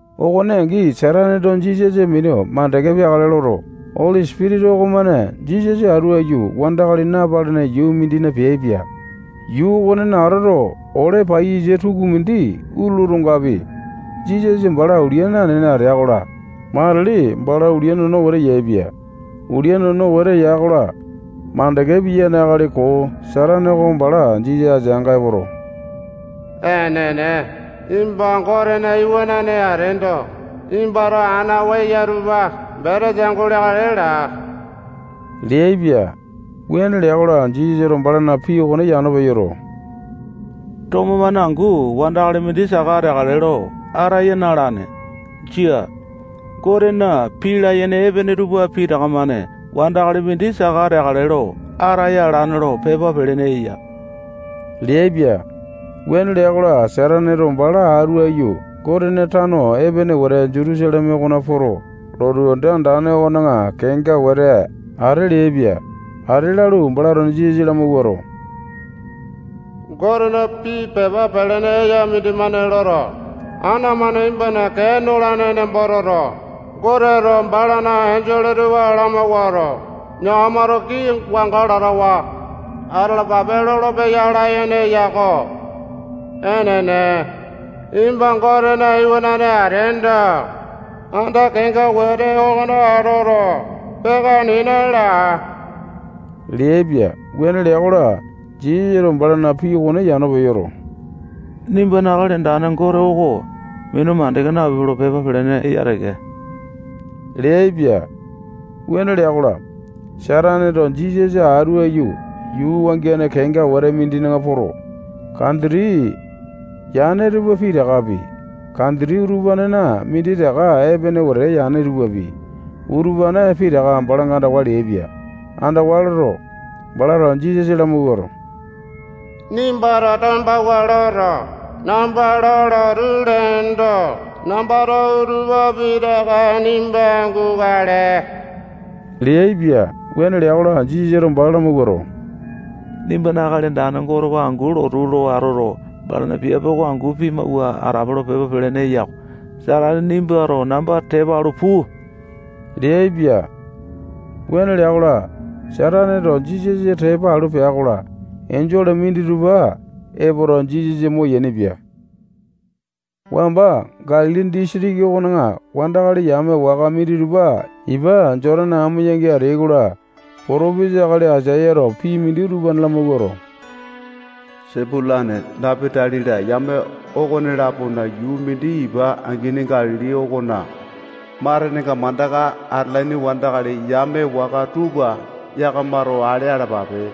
Okone angi, Sataneto Jisasa minu mandeke peakale loto, Oli Sipitisa okomane Jisasa atu aiyu wandakali napalene yuu mindina peaipia. Yuu okonena atoto, ole paiyasa tukumindi utulu otongapi, Jisasa bala ulia nanene atea-kola, matili bala ulia nono wete yaepia. Ulia nono wete ya-kola, mandeke piyane akali koo Satane oko bala Jisasa ateanga epoto, enene, nimba Gotena iwanane ateendo, nimbato ana oo eya utupa betesa guleakale laa leaipia. Wuane lea-kola, Jisasato balana pii okone yano peyoto, tomo-mane angu wandakali mindi saka ateakale lo ataya na-alane. Jia. Gotena pii layene epene tupa pitaka-mane wandakali mindi saka ateakale lo ataya alane lo pepa pelene eya leaipia. Wuane lea-kola, Sataneto bala atu aiyu Gotena tano epene wete Jutusaleme okona poto, lotu anda andane okona kenga wete ate leaipia. Ate lalu, balato Jisasa lamawuato, Gotena pii pepa pelene eya mindimane loto, ana-mane nimbana kee nolane nembo toto, Goteto balana enjole tupa lamawuato, yakamato kii wanga latawa atalapape lolopeya layene eya-ko. Enene, nimba Gotena Iwanane ateendo, anda kenga wete okona atoto, peaka nena laa leaipia. Wuane lea-kola, Jisasato balana pii okone yano peyoto, nimbana Akali Andane Gote oko minu mandeke napipe lo pepa pelene eya teke leaipia. Wuane lea-kola, Sataneto Jisasa atu aiyu yuu wangiane kenga wete mindina poto, kanditi yane tupa pitakapi, kanditi utupanena minditaka epene wete yane tupapi, utupane pitaka balanga andawa leaipia. Andawa loto, balato Jisasa lamawuato, nimbato tombawua loto, namba lo lotu leendo, nambato utupa pitaka nimba gukale leaipia. Wuane lea-kola, Jisasato bala lamawuato, nimbana Akali Andane Gote oko angu lotu lo atoto, balana piape oko angu pimawua atape lo pepa pelene eya-ko. Satane nimbato namba tepa alu puu leaipia. Wuane lea-kola, Sataneto Jisasa tepa alu pea-kola, enjole minditupa epoto, Jisasa moyaini-pia. Wamba Galili disitiki okona wandakali yame waka minditupa ipa Jotane amo yangi ateai-kola, potopesa akali Aisayato pii mindi utupane lamawuato, Sepulane, Napatali-la, yame okone-lapona yuu mindi ipa angini Galili okona matenenga mandaka atalaini wandakali yame waka tupa yakamato ale alapape.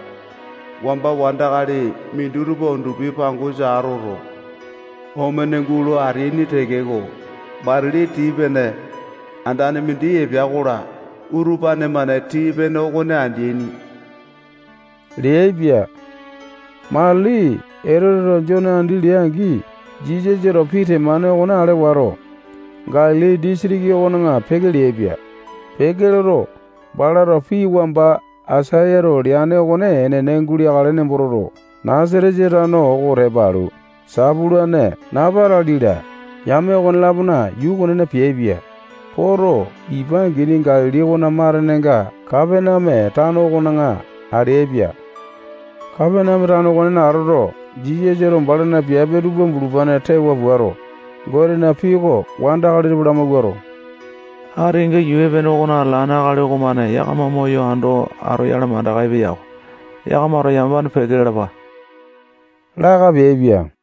Wamba wandakali minditupa undupi pangosa atoto, omene gulo ateaini tekeko, matili tii-pene andane mindi epea-kola, utupane-mane tii-pene okone andeaini leaipia. Matili Etoteto Jone andi lea-angi, Jisasato pii temane okone ale wato, Galili disitiki okona peke leaipia. Peke loto, balato pii wamba Aisayato leane okone enene guleakale nembo toto, Nasatesa tano oko tepa alu, Sepulane, Napatali-la, yame okone-lapona yuu okonena peaipia. Poto, ipa angini Galili okona matenenga Kapaneame tano okona ateaipia. Kapaneame tano okonena atoto, Jisasato balana piape tupa bulupane tewa puato, Gotena pii oko wandakali tupa lamawuato, ati kenga yuu epene okona atalane akali okomane yakama moyo ando atoyale mandaka epeya-ko. Yakamato yamapane peke lalapa laka peaipia.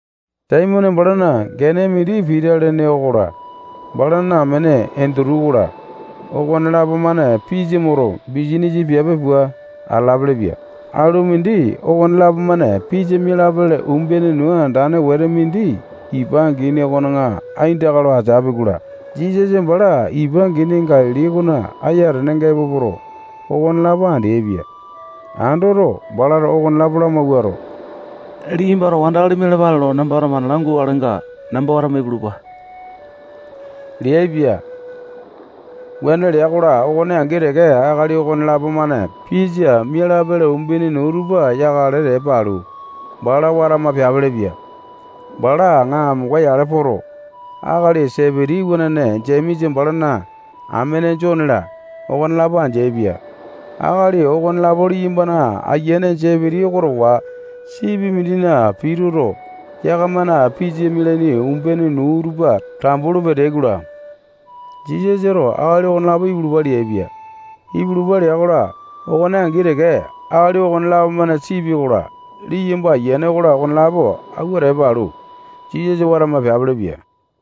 Saimone balana gene mindi Pita lene okola, balana amene Endutu okola, okonelapo-mane pisa moto, bisanisa piape pua atalapele-pia. Alu mindi okonelapo-mane pisa mialapele umbene nuu andane wete mindi ipa angini okona aindaka lo ateapi-kola, Jisasa bala ipa angini Galili okona ayatenenga epo poto, okonelapo andeaipia. Andoto, balato okonelapo lamawuato, liyambato wandakali mialapale lo nambato mana langukalenga, namba watama ipulupa leaipia. Wuane lea-kola, okone angi teke akali okonelapo-mane pisa mialapele umbene nuu tupa yakale tepa alu, bala watama peapelepia. Bala aŋa amonga-yale poto, akali Sepiti iwanane Jemesa, balana amene Jone-la, okonelapo andeaipia. Akali okonelapo liyambana ayiane Sepiti oko towa sipi mindina pituto, yakamana pisa mialaini umbene nuu tupa tambu lo peteai-kola, Jisasato akali okonelapo ipulupa leaipia. Ipulupa lea-kola, okone angi teke, akali okonelapo-mane sipi okola, liyamba ayiane okola, okonelapo awua tepa alu, Jisasa watama peapelepia.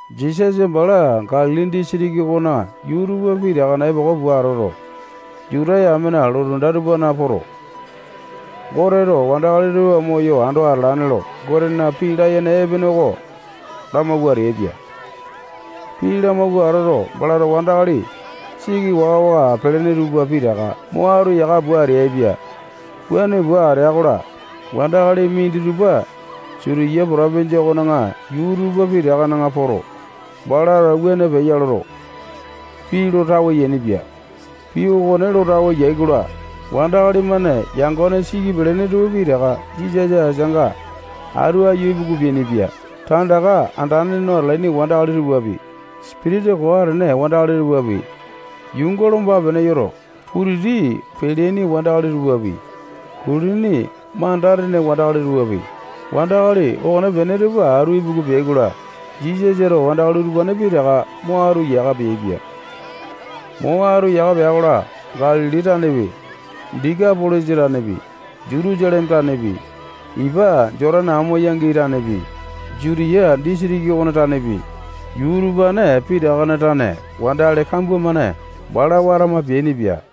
Jisasa bala Galili disitiki okona yuu tupa pitakana epoko pua atoto, Juta yamena lotu anda tupana poto, Goteto wandakali tupa moyo ando atalane lo, Gotena pii layene epene oko lamawua ateaipia. Pii lamawua atoto, balato wandakali siki waka-waka pelene tupa pitaka mo atu yaka pua ateaipia. Wuane pua atea-kola, wandakali minditupa Sitiya potopinjia okona yuu tupa pitakana poto, balato wuane peya loto, pii lo tawe yainipia. Pii okone lo tawe yai-kola, wandakali-mane yangone siki pelene tupa pitaka Jisasa ateanga atu aiyu ipuku peainipia. Tandaka andane no atalaini wandakali tupapi, sipitisa koo atene wandakali tupapi, yuunga lomba-pene yoto, putiti peyalaini wandakali tupapi, kulini manda-tene wandakali tupapi, wandakali okonepene tupa atu ipuku peai-kola, Jisasato wandakali utupane pitaka mo atu yaka peaipia. Mo atu yaka pea-kola, Galili tanepi, Dekapolisa tanepi, Jutusaleme tanepi, ipa Jotane amo yangi tanepi, Jutiya disitiki okona tanepi, yuu utupane pitakana tane wandakali kambua-mane bala watama peainipia.